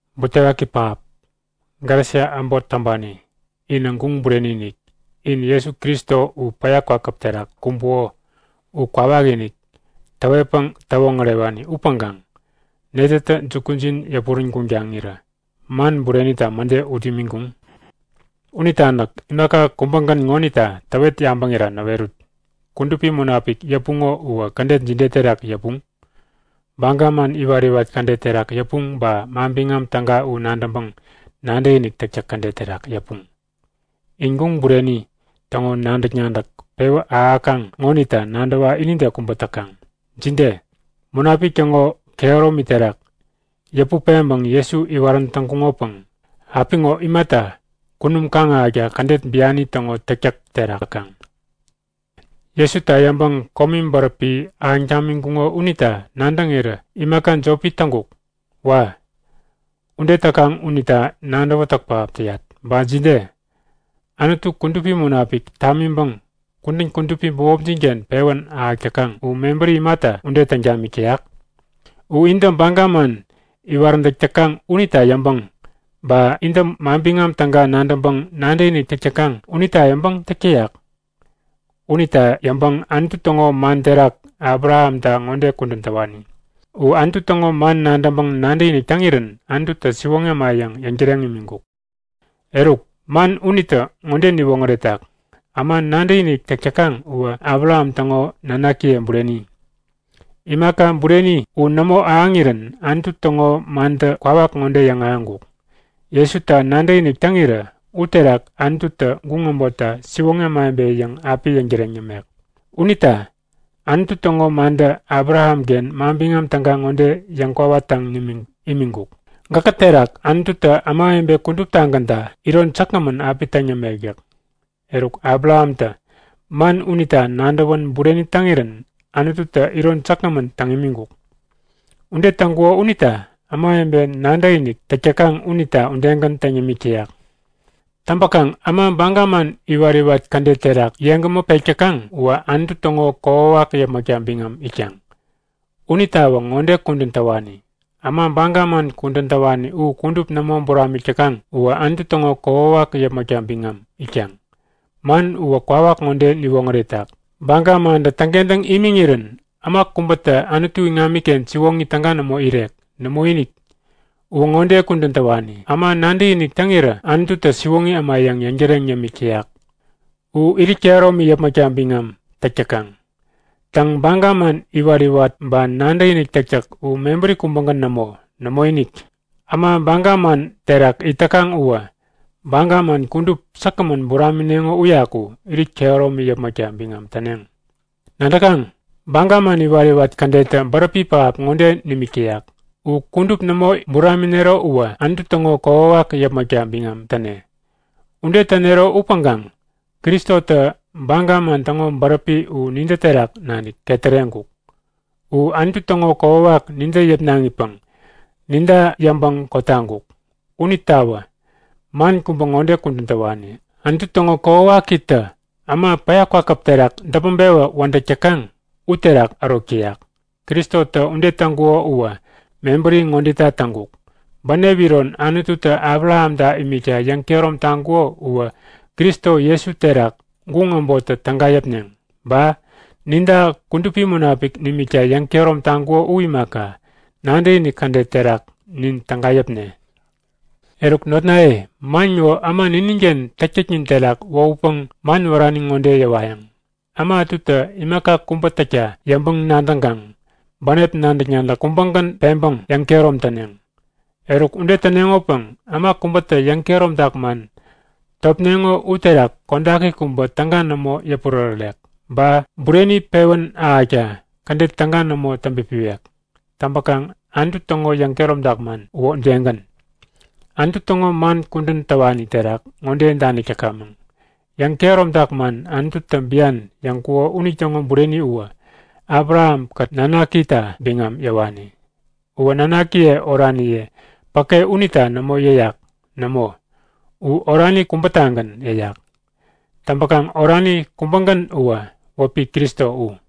Butewaki pähap! Galesia äbot täŋpani, inä guŋ bureni-inik! In Jesu Kristo u päya kwakäp terak kumbuko u kwawakinik täwetpäŋ täwoŋärewani upäŋkaŋ netätä jukujin yäpurän guŋ taŋirä man burenita mäde ut imiŋkuŋ? Unita näk imaka kubägän ŋonita täwet yabäŋira näwerut; Kudupi Munapik yäpuŋo uwä kädet jide terak yäpuŋ? Baga man iwat-iwat kädet terak yäpuŋ ba Manbiŋam Täga u nadäŋpäŋ nadäkinik täktäk kädet terak yäpuŋ? In guŋ bureni täŋo nadäk-nadäk pewä ahäkaŋ ŋonita nadäwa inide kubä täkaŋ! Jide? Munapik täŋo kehäromi terak yäput-peŋpäŋ Jesu iwarän täŋkuŋopäŋ apiŋo imata kunum kaŋ-ahäkta kädet biani täŋo täktäk terak täkaŋ? Jesuta yäŋpäŋ komi bäräpi ahäŋ tamiŋkuŋo unita nadäŋirä imaka jopi täŋkuk? Wa! Ude täkaŋ unita nadäwätäk pähap täyat. Ba jide? Anutu Kudupi Munapik tamiŋpäŋ kudän kudupi bämopjin-ken pewän ahäk täkaŋ u mebäri imata ude täŋ tamik täyak? U intä baga man iwaräntäk täkaŋ unita yäŋpäŋ, ba intä Manbiŋam Täga nadäŋpäŋ nadäkinik täk täkaŋ unita yäŋpäŋ täk täyak? Unita yäŋpäŋ Anutu täŋo man terak Abrahamta ŋode kudän täwani; U Anutu täŋo man nadäŋpäŋ nadäkinik täŋirän Anututä siwoŋi äma yäŋ yäŋtäreŋ imiŋkuk. Eruk, man unitä ŋode niwoŋäretak; Äma nadäkinik täk täkaŋ uwä Abraham täŋo nanakiye bureni. Imaka bureni u nämo ahäŋirän Anutu täŋo mantä kwawa ŋode yäŋahäŋkuk; Jesuta nadäkinik täŋirä uterak Anututä guŋ äbotta siwoŋi ämawebe yäŋ api yäŋtäreŋ yämek. Unita Anutu täŋo mantä Abrahamken Manbiŋam Täga ŋode yäŋkwawak taŋ imiŋkuk; Gäkä terak Anututä ämawebe kuduptagänta iron säkgämän api täŋ yämek yäk. Eruk Abrahamtä man unita nadäwän bureni täŋirän Anututä iron säkgämän täŋ imiŋkuk. Ude täŋkuko unita ämawebe nadäkinik täk täkaŋ unita udegän täŋ yämik täyak. Täŋpäkaŋ äma baga man iwat-iwat kädet terak yeŋgämä pek täkaŋ uwä Anutu täŋo kokwawak yäpmäkta biŋam itkaŋ. Unitawä ŋode kudän täwani; Äma baga man kudän täwani u kudup nämo buramik täkaŋ uwä Anutu täŋo kokwawak yäpmäkta biŋam itkaŋ. Man uwä kwawak ŋode niwoŋäretak; Baga mantä täŋkentäŋ imiŋirän äma kubätä Anutu iŋamiken siwoŋi täga nämo irek. Nämoinik! Uwä ŋode kudän täwani; Äma nadäkinik täŋirä Anututä siwoŋi äma yäŋ yäŋtäreŋ yämik täyak u irit kehäromi yäpmäkta biŋam täk täkaŋ. Täŋ, baga man iwat-iwat ba nadäkinik täktäk u mebäri kubägän nämo. Nämoinik! Äma baga man terak it täkaŋ uwä baga man kudup säkgämän buramineŋo uyaku irit kehäromi yäpmäkta biŋam täneŋ. Nadäkaŋ? Baga man iwat-iwat kädettä bäräpi pähap ŋode nimik täyak; U kudup nämo buraminero uwä Anutu täŋo kokwawak yäpmäkta biŋam täne. Ude tänero upäŋkaŋ Kristotä baga man täŋo bäräpi u nintä terak nanik ketäreŋkuk. U Anutu täŋo kokwawak nintä yäpnaŋipäŋ ninta yäŋpäŋ kotaŋkuk. Unitawä man kubä ŋode kudän täwani; Anutu täŋo kokwawakitä äma päya terak däpmäŋ-pewä wädäk täkaŋ uterak ärok täyak. Kristotä ude täŋkuko uwä mebäri ŋodeta täŋkuk; Bänep iron Anututä Abrahamta imikta yäŋkehärom taŋkuko uwä Kristo Jesu terak guŋ äbottä täga yäpneŋ. Ba ninta Kudupi Munapik nimikta yäŋkehärom taŋkuko u imaka, nadäkinik kädet terak nin täga yäpne. Eruk notnaye man ŋo äma nininken täktäknin terak wohutpäŋ man wärani ŋode yäwayäŋ; Äma ätutä imaka kubä täkta yäŋpäŋ-nadäŋkaŋ bänep nadäk-nadäk kubägän peŋpäŋ yäŋkehärom täneŋ. Eruk ude täneŋopäŋ äma kubätä yäŋkehäromtak man topneŋo uterak kodaki kubä täga nämo yäpurärärek ba bureni pewän ahäkta kädet täga nämo täŋpipiwek. Täŋpäkaŋ Anutu täŋo yäŋkehäromtak man uwä udegän. Anutu täŋo man kudän täwani terak ŋode danik täkamäŋ; Yäŋ-kehäromtak man Anututä bian yäŋkuko unitäŋo bureni uwä Abrahamkät nanakita biŋam yäwani. Uwä nanakiye oraniye päke unita nämo yäyak. Nämo, u orani kubätagän yäyak. Täŋpäkaŋ orani kubägän uwä wäpi Kristo u.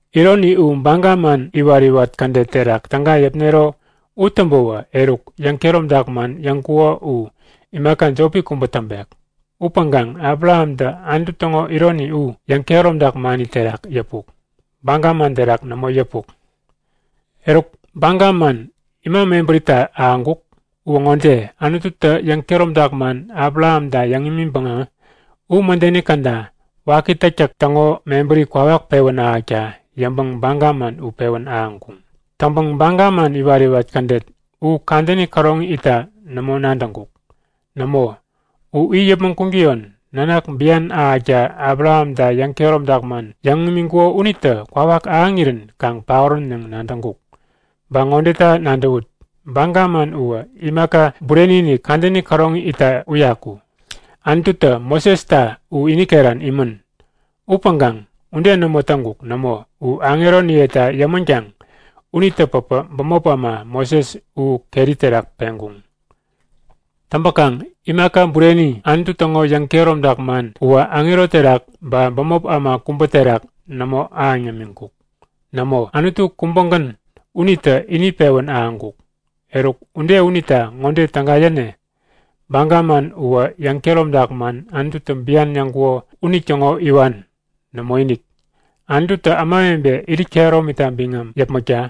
Ironi u baga man iwat-iwat kädet terak täga yäpnero u täŋpäwä, eruk yäŋkehäromtak man yäŋkuko u imaka jopi kubä täŋpek. Upäŋkaŋ Abrahamtä Anutu täŋo ironi u yäŋkehäromtak mani terak yäpuk, baga man terak nämo yäpuk. Eruk, baga man ima mebärita ahäŋkuk? Uwä ŋode; Anututä yäŋkehäromtak man Abrahamta yäŋ imiŋpäŋä u mädeni käda waki täktäk täŋo mebäri kwawak pewän ahäkta yäŋpäŋ baga man u pewän ahäŋkuŋ. Täŋpäŋ baga man iwat-iwat kädet u kadäni käroŋi itta nämo nadäŋkuk. Nämo, u it yäpmäŋ kuŋtäyon Nanak bian ahäkta Abrahamta yäŋkehäromtak man yäŋ imiŋkuko unitä kwawak ahäŋirän kaŋ paorän yäŋ nadäŋkuk. Ba ŋodeta nadäwut; Baga man uwä imaka bureni-inik, kadäni käroŋi itta uyaku, Anututä Mosesta u ini keran imän. Upäŋkaŋ ude nämo täŋkuk. Nämo, u aŋeroniyeta yämänkaŋ unitä päpä bämop äma, Moses u keri terak peŋkuŋ. Täŋpäkaŋ imaka bureni, Anutu täŋo yäŋkehäromtak man uwä aŋero terak ba bämop äma kubä terak nämo ahäŋ yämiŋkuk. Nämo, Anutu kubägän unitä ini pewän ahäŋkuk. Eruk, ude unita ŋode täga yäne? Baga man uwä yäŋkehäromtak man Anututä bian yäŋkuko unitäŋo iwan? Nämoinik! Anututä ämawebe irit kehäromita biŋam yepmakta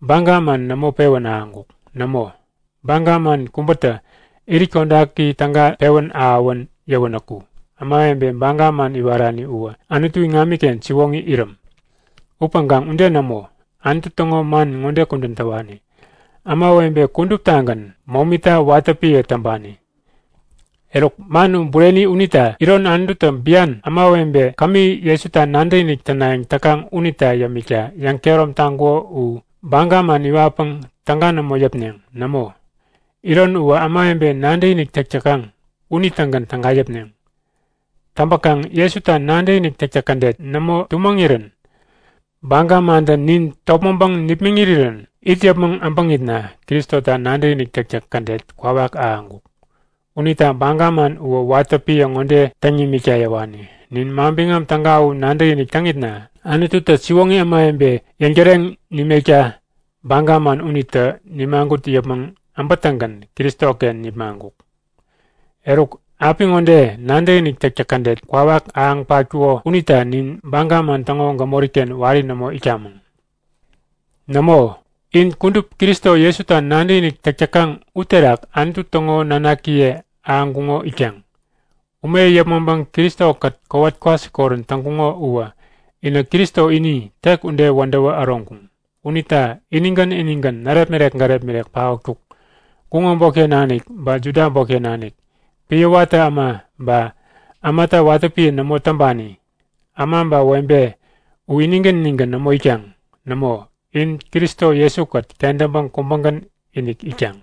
baga man nämo pewän ahäŋkuŋ. Nämo, baga man kubätä irit kodaki täga pewän ahäwän yäwänäku ämawebe baga man iwarani uwä Anutu iŋamiken siwoŋi iräm. Upäŋkaŋ ude nämo. Anutu täŋo man ŋode kudän täwani; Ämawebe kuduptagän momita watä piä täŋpani. Eruk, man u bureni unita iron Anututä bian, ämawebe kämi Jesuta nadäkinik tänayäŋ täkaŋ unita yämikta yäŋkehärom taŋkuko u baga man iwatpäŋ täga nämo yäpneŋ. Nämo, iron uwä ämawebe nadäkinik täk täkaŋ unitägän täga yäpneŋ. Täŋpäkaŋ Jesuta nadäkinik täktäk kädet nämo tumäŋirän baga mantä nin topmäŋpäŋ nipmäŋ irirän it yäpmäŋ äbäŋitna Kristota nadäkinik täktäk kädet kwawak ahäŋkuk. Unita baga man uwä watä piä ŋode täŋ nimikta yäwani; Nin Manbiŋam Täga u nadäkinik täŋitna Anututä siwoŋi ämawebe yäŋtäreŋ nimekta baga man unitä nimagut yäpmäŋ äbätäŋgän Kristoken nipmaŋkuk. Eruk apiŋode nadäkinik täktäk kädet kwawak ahäŋ patkuko unita nin baga man täŋo gämori-ken wari nämo itkamäŋ. Nämo, in kudup Kristo Jesuta nadäkinik täk täkaŋ uterak Anutu täŋo nanakiye ahäŋkuŋo itkaŋ. Ume yäpmäŋpäŋ Kristo-kät kowat kwasikorän täŋkuŋo uwä inä Kristo ini, tek ude wädäwä äroŋkuŋ. Unita inigän inigän, närepmirek gärepmirek paotkuk. Guŋ äbotken nanik ba Juda äbotken nanik, piä watä äma ba ämata watä piä nämo täŋpani, äma ba webe u inigän inigän nämo itkaŋ. Nämo, in Kristo Jesu-kät kentäŋpäŋ kubägän-inik itkaŋ.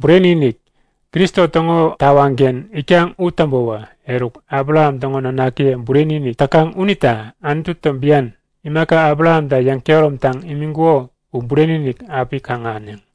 Bureni-inik! In Kristo täŋo tawaŋken itkaŋ u täŋpäwä, eruk Abraham täŋo nanakiye bureni-inik täkaŋ unita Anututä bian imaka Abrahamta yäŋkehäromtaŋ imiŋkuko u bureni-inik api kaŋ-ahäneŋ.